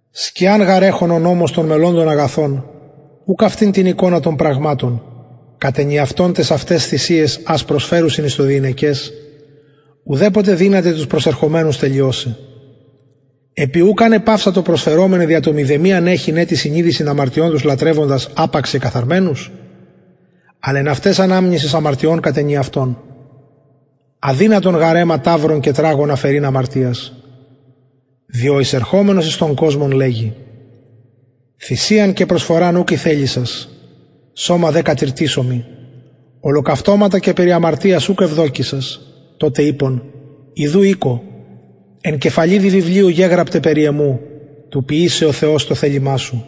σκιαν γαρ εχων ο νομος των μελλοντων αγαθων ουκ αυτην την εικονα των πραγματων κατ ενιαυτον ταις αυταις θυσιαις ας προσφερουσιν εις το διηνεκες ουδεποτε δυνανται τους προσερχομενους τελειωσαι επει ουκ αν επαυσαντο προσφερομεναι δια το μηδεμιαν εχειν ετι συνειδησιν αμαρτιων τους λατρευοντας απαξ κεκαθαρμενους αλλ εν αυταις αναμνησις αμαρτιων κατ ενιαυτον αδυνατον γαρ αιμα ταυρων και τραγων αφαιρειν αμαρτιας διο εισερχομενος εις τον κοσμον λεγει θυσιαν και προσφοραν ουκ ηθελησας σωμα δε κατηρτισω μοι ολοκαυτωματα και περι αμαρτιας ουκ ευδοκησας τοτε ειπον ιδου ηκω εν κεφαλιδι βιβλιου γεγραπται περι εμου του ποιησαι ο θεος το θελημα σου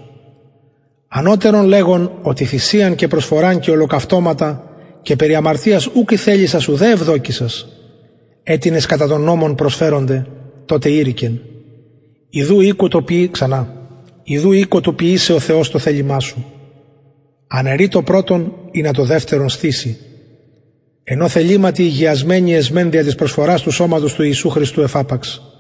ανωτερον λεγων οτι θυσιαν και προσφοραν και ολοκαυτωματα και περι αμαρτιας ουκ ηθελησας ουδε ευδοκησας αιτινες κατα τον νομον προσφερονται τοτε ειρηκεν ιδου ηκω του ποιησαι ο θεος το θελημα σου αναιρει το πρωτον ινα το δευτερον στηση εν ω θεληματι ηγιασμενοι εσμεν οι δια της προσφορας του σωματος ιησου χριστου εφαπαξ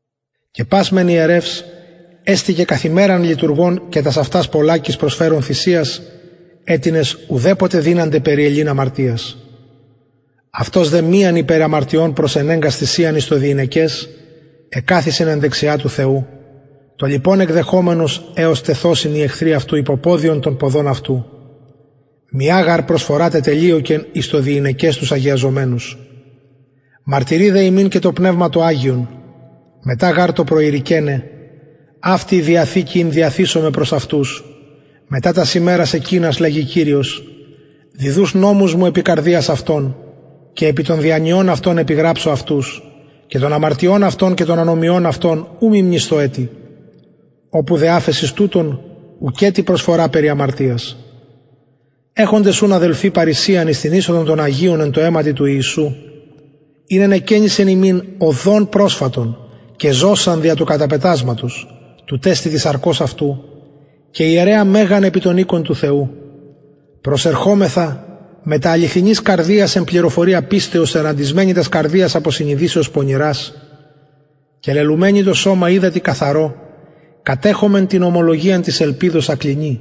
και πας μεν ιερευς εστηκεν καθ ημεραν λειτουργων και τας αυτας πολλακις προσφερων θυσιας αιτινες ουδεποτε δυνανται περιελειν αμαρτιας αυτος δε μιαν υπερ αμαρτιων προσενεγκας θυσιαν εις το διηνεκες εκαθισεν εν δεξια του θεου το λοιπον εκδεχομενος εως τεθωσιν οι εχθροι αυτου υποποδιον των ποδων αυτου μια γαρ προσφορα τετελειωκεν εις το διηνεκες τους αγιαζομενους μαρτυρει δε ημιν και το πνευμα το αγιον μετα γαρ το προειρηκεναι αυτη η διαθηκη ην διαθησομαι προς αυτους μετα τας ημερας εκεινας λεγει κυριος διδους νομους μου επι καρδιας αυτων και επι των διανοιων αυτων επιγραψω αυτους και των αμαρτιων αυτων και των ανομιων αυτων ου μη μνησθω ετι οπου δε αφεσις τουτων ουκετι προσφορα περι αμαρτιας εχοντες ουν αδελφοι παρρησιαν εις την εισοδον των αγιων εν τω αιματι ιησου ην ενεκαινισεν ημιν οδον προσφατον και ζωσαν δια του καταπετασματος τουτ εστιν της σαρκος αυτου και ιερεα μεγαν επι τον οικον του θεου προσερχωμεθα μετα αληθινης καρδιας εν πληροφορια πιστεως ερραντισμενοι τας καρδιας απο συνειδησεως πονηρας και λελουμενοι το σωμα υδατι καθαρω κατεχωμεν την ομολογιαν της ελπιδος ακλινη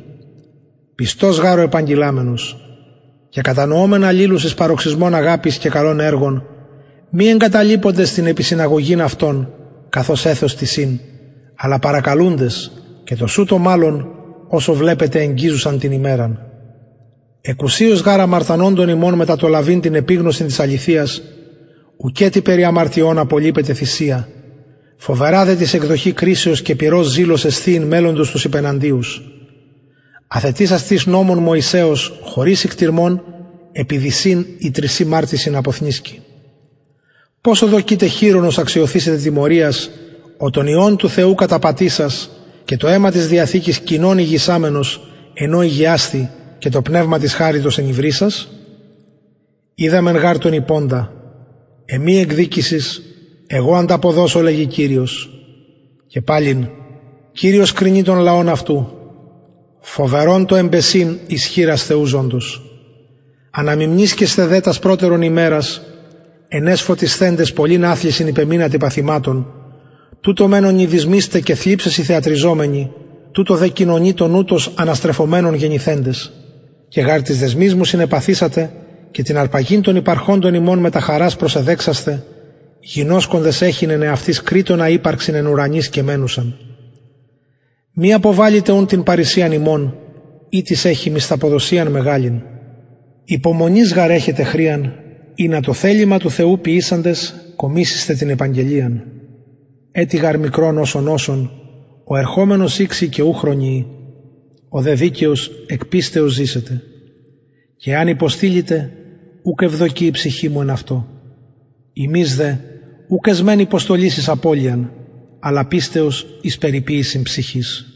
πιστος γαρ ο επαγγειλαμενος και κατανοωμεν αλληλους εις παροξυσμον αγαπης και καλων εργων μη εγκαταλειποντες την επισυναγωγην εαυτων καθως εθος τισιν αλλα παρακαλουντες και τοσουτω μαλλον οσω βλεπετε εγγιζουσαν την ημεραν εκουσιως γαρ αμαρτανοντων ημων μετα το λαβειν την επιγνωσιν της αληθειας ουκετι περι αμαρτιων απολειπεται θυσια φοβερα δε τις εκδοχη κρισεως και πυρος ζηλος εσθιειν μελλοντος τους υπεναντιους αθετησας τις νομον μωυσεως χωρις οικτιρμων επι δυσιν η τρισιν μαρτυσιν αποθνησκει ποσω δοκειτε χειρονος αξιωθησεται τιμωριας ο τον υιον του θεου καταπατησας και το αιμα της διαθηκης κοινον ηγησαμενος εν ω ηγιασθη και το πνευμα της χαριτος ενυβρισας οιδαμεν γαρ τον ειποντα εμοι εκδικησις εγω ανταποδωσω λεγει κυριος και παλιν κυριος κρινει τον λαον αυτου φοβερον το εμπεσειν εις χειρας θεου ζωντος αναμιμνησκεσθε δε τας προτερον ημερας εν αις φωτισθεντες πολλην αθλησιν υπεμεινατε παθηματων τουτο μεν ονειδισμοις τε και θλιψεσιν θεατριζομενοι τουτο δε κοινωνοι των ουτως αναστρεφομενων γενηθεντες και γαρ τοις δεσμοις μου συνεπαθησατε και την αρπαγην των υπαρχοντων υμων μετα χαρας προσεδεξασθε γινωσκοντες εχειν εαυτοις κρειττονα υπαρξιν εν ουρανοις και μενουσαν μη αποβαλητε ουν την παρρησιαν υμων ητις εχει μισθαποδοσιαν μεγαλην υπομονης γαρ εχετε χρειαν ινα το θελημα του θεου ποιησαντες κομισησθε την επαγγελιαν ετι γαρ μικρον οσον οσον ο ερχομενος ηξει και ου χρονιει ο δε δικαιος εκ πιστεως ζησεται και εαν υποστειληται ουκ ευδοκει η ψυχη μου εν αυτω ημεις δε ουκ εσμεν υποστολης εις απωλειαν αλλα πιστεως εις περιποιησιν ψυχης